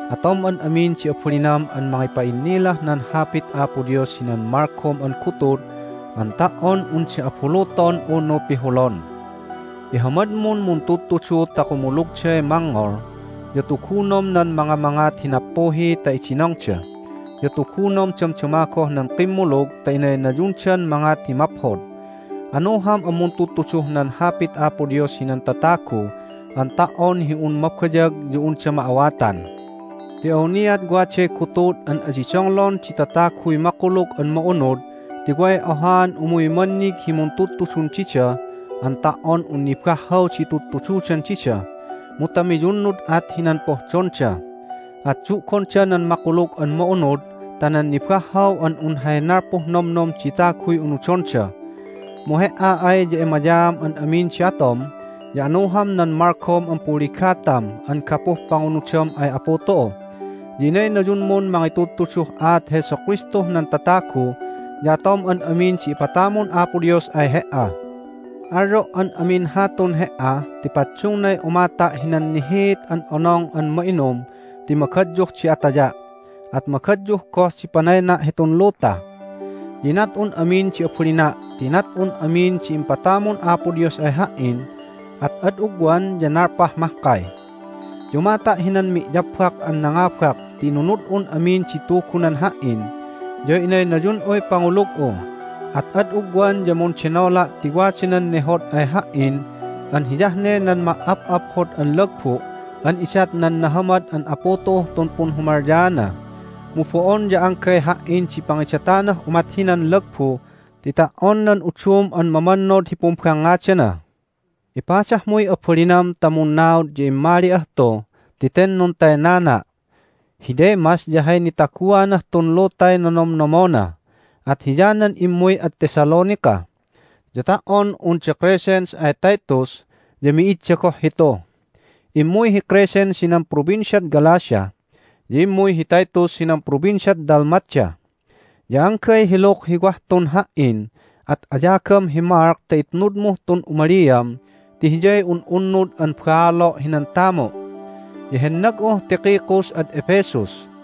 Atom an amin di abalinam an mangipa'innilah nan Hapit Apo Dios hinan malgom an gutud an ta"on unda abuluton unu pihulon. Ihamadmun muntudtudu ta kumulugday mangngol, ya tugunom nan mangamangat hi nappuhi ta idinongda, ya tugunom damdama goh nan kimmulug ta inaynayundan mangat hi maphod. Anuham an muntudtuduh nan Hapit Apo Dios hinan tatagu an ta"on hi un mabayag ya unda ma'awatan. Ti awniat waday gutud an adi donglon di tataguy Makulug an Ma'unud ti way ohaan umuy mannig hi muntudtudun dida an ta"on un nibahhaw di itudtududan dida, mu ta miyunnud at hinan pohdonda. At du'gonda nan Makulug an Ma'unud ta nan nibahhaw an un hay nalpuh nomnom di taguy unudonda. Mu he"a ay ya emayaam an amin di atom, ya anuham nan malgom an punligatam an gapuh pangunudam ay Apu tu'u, ya inaynayunmun mangitudtuduh aat Jesu Kristuh nan tatagu, ya atom an amin di ipatamun Apo Dios ay he"a. Alyo' an amin hatun he"a ti paddungnay umata' hinan nihiit an Onong an Ma'inum ti magadyuh di ataya', at magadyuh goh di panayna' hitun luta. Ya inat'un amin di abalina' ti inat'un amin di impatamun Apo Dios ay ha"in, at ad ugwan ya nalpah mahkay. Ya umata' hinan mi'yabbak an nangabak ti inunud'un amin di Tugunan ha"in, ya innaynayun'uy pangulug'u. At ad ugwan ya mundenola' ti wada nan nehod ay ha"in an hiyah ne nan ma"ap'aphod an lagbu' an idat nan nahamad an Apu tu'uh tun punhumalyaana. Mu bo'on ya anggay ha"in di pangidatanah umat hinan lagbu ti ta"on nan udum an mamannod hi pumbangngadana. Ipadahmuy abalinam ta munnaud ya immali'ah tu ti ten nuntaynana'. Hi Demas ya hay nitaguanah tun lutay nonomnomona, at hiyanan immuy ad Thessalonica. Ya ta"on un da Crescens ay Titus ya mi'idda goh hitu. Immuy hi Crescens hinan Provinciad Galatia, ya immuy hi Titus hinan Provinciad Dalmatia. Ya anggay hi Luke hi wah tun ha"in. At ayagam hi Mark ta itnudmuh tun umaliam ti hiyay un'unnud an baalo' hinan tamu'. Ya hennag'uh Tychicus ad Ephesus.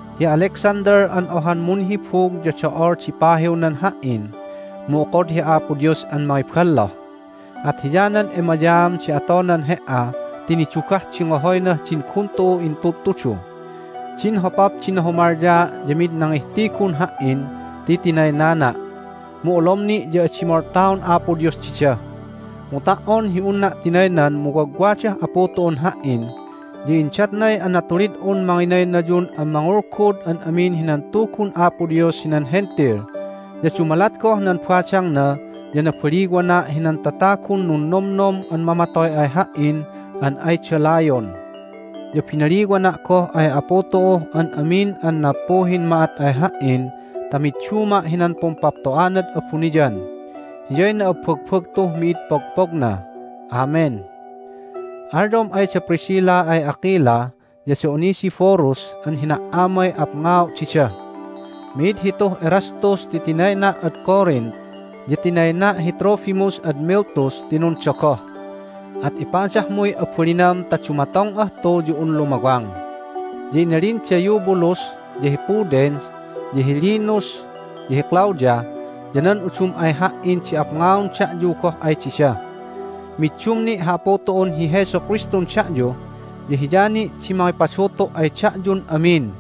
Hi Alexander an ohan munhibug ya do'ol di pahiwnan ha"in, mu okod hi Apo Dios an mangiballoh. At hiyanan emayaam di atonan he"a ti nidugah di ngohoynah din gun tu'u intudtudu. Din hopap di nahumalyaa' ya mid nangihtigun ha"in ti tinaynana'. Mu olom ni' ya adi moltaon Apo Dios dida. Mu ta"on hi unna' tinaynan mu wagwadah Apu tu'un ha"in, ya indatnay anatulid'un manginaynayun an mangulgud an amin hinan Tugun Apo Dios hinan Hentil. Ya dumalat goh nan badangna ya nabaliwana' hinan tatagun nunnomnom an mamatoy ay ha"in an ayda layon. Ya binaliwana' goh ay Apu tu'uh an amin an nappuhin ma'at ay ha"in ta midduma' hinan pumpapto'anad abuniyan. Hiyay na'abbagbagtuh mid di pogpogna! Amen! Alyom ay da Priscilla ay Aquila ya da Onesiphorus an hina"amay apngao' dida. Mi'id hituh Erastus ti tinayna' ad Corinth, ya tinayna' hi Trophimus ad Miletus ti nundogoh. At ipadahmuy abalinam ta dumatong'ah tu ya un lumawang. Ya inalin da Eubulus, ya hi Pudens, ya hi Linus, ya hi Claudia, ya nan udum ay ha"in di apngaon da'yu goh ay dida. Middum ni' hi Apu tu'un hi Jesu Kristun da'yu, ya Hiya ni' di mangipadutu' ay da'yu amin.